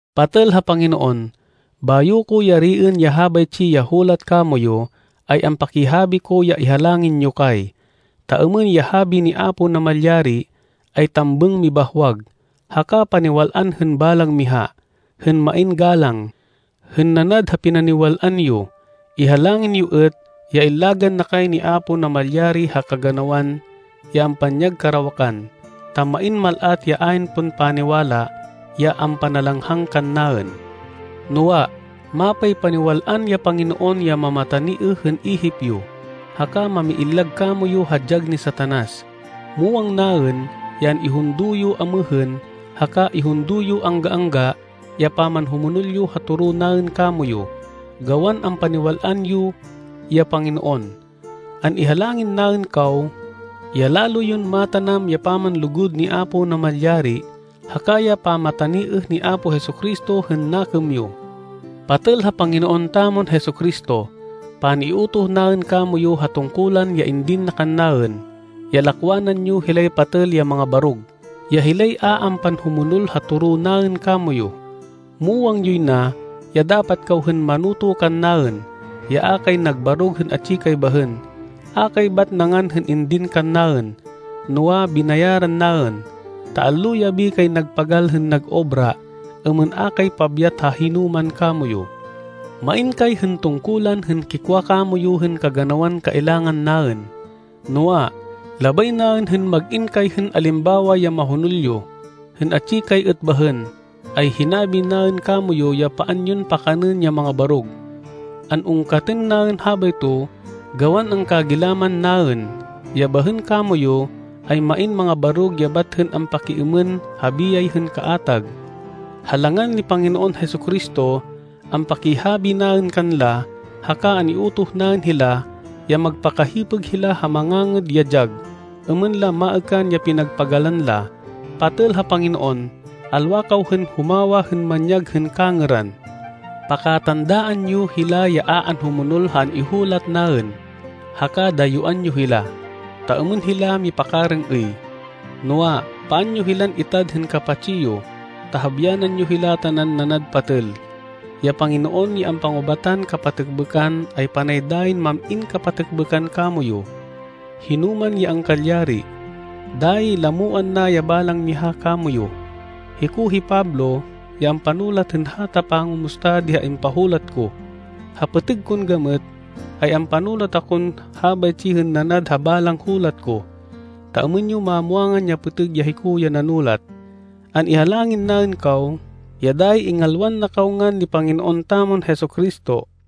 Patêl ha Panginoon, bayo ko yariên ya habaytsi ya hulat kamoyu, ay ampakihabi ko ya ihalangin yo kay, ta êmên ya habi ni Apo Namalyari, ay tambêng mibahwag, haka paniwal-an hên balang miha, hên main galang, hên nanad ha pinaniwal-an yo. Ihalangin yo êt ya illagan na kay ni Apo Namalyari ha kaganawan ya ampanyag karawakan, ta main mal-at ya ayn pon paniwala, ya ampanalanghang kannaên. Noa, mapaypaniwal-an ya Panginoon ya mamataniêh hên ihip yo, haka mamiillag kamoyu ha dyag ni Satanas. Muwang naên ya an-ihundo yo amêhên, haka ihundo yo angga-angga ya pamanhumonol yo ha toro naên kamoyu, gawan ampaniwal-an yo ya Panginoon. An-ihalangin naên kaw ya lalo yon matanam ya pamanlugud ni Apo Namalyari, haka ya pamataniêh ni Apo Jesu-Cristo hên nakêm yo. Patêl ha Panginoon tamon Jesu-Cristo, pan-iutoh naên kamoyu ha tungkulan ya indin na kannaên, ya lakwanan yo hilay patêl ya mangabarog, ya hilay a ampanhumonol ha toro naên kamoyu. Muwang yoy na ya dapat kaw hên manoto kannaên, ya a kay nagbarog hên atsi kay bahên. A kay bat nangan hên indin kannaên, noa, binayaran naên, ta allo-yabi kay nagpagal hên nag-obra, êmên a kay pabyat ha hinoman kamoyu. Main kay hên tungkulan hên kikwa kamoyu hên kaganawan kailangan naên, noa, labay naên hên mag-in kay hên alimbawa ya mahonol yo. Hên atsi kay êt bahên, ay hinabi naên kamoyu ya paan yon pakanên ya mangabarog. An-ungkatên naên habayto gawan angkagilaman naên ya bahên kamoyu, ay main mangabarog ya bat hên ampakiêmên ha biyay hên kaatag. Ha langan ni Panginoon Jesu-Cristo, ampakihabi naên kanla, haka an-iutoh naên hila, ya magpakahipêg hila ha mangangêd ya dyag, êmên la maêkan ya pinagpagalan la. Patêl ha Panginoon, alwa kaw hên humawa hên manyag hên kangêran. Pakatandaan yo hila ya a anhumonol ha an-ihulat naên, haka dayuán yo hila, ta êmên hila mipakarêng-êy. Noa, paan yo hilan itad hên kapatsi yo, ta habyanan yo hila tanan nanad patêl. Ya Panginoon ya ampangubatan kapatêkbêkan ay panay dayin mam-in kapatêkbêkan kamoyu, hinoman ya angkalyari. Dayi lamoan na ya balang miha kamoyu. Hiko hi Pablo ya ampanulat hên hata pangumusta di ha impahulat ko. Ha pêtêg kon gamêt ay ampanulat akon habaytsi hên nanad ha balang hulat ko, ta êmên yo mamwangan ya pêtêg ya hiko ya nanulat. An-ihalangin naên kaw ya dayi ingalwan na kaw ngan ni Panginoon tamon Jesu-Cristo.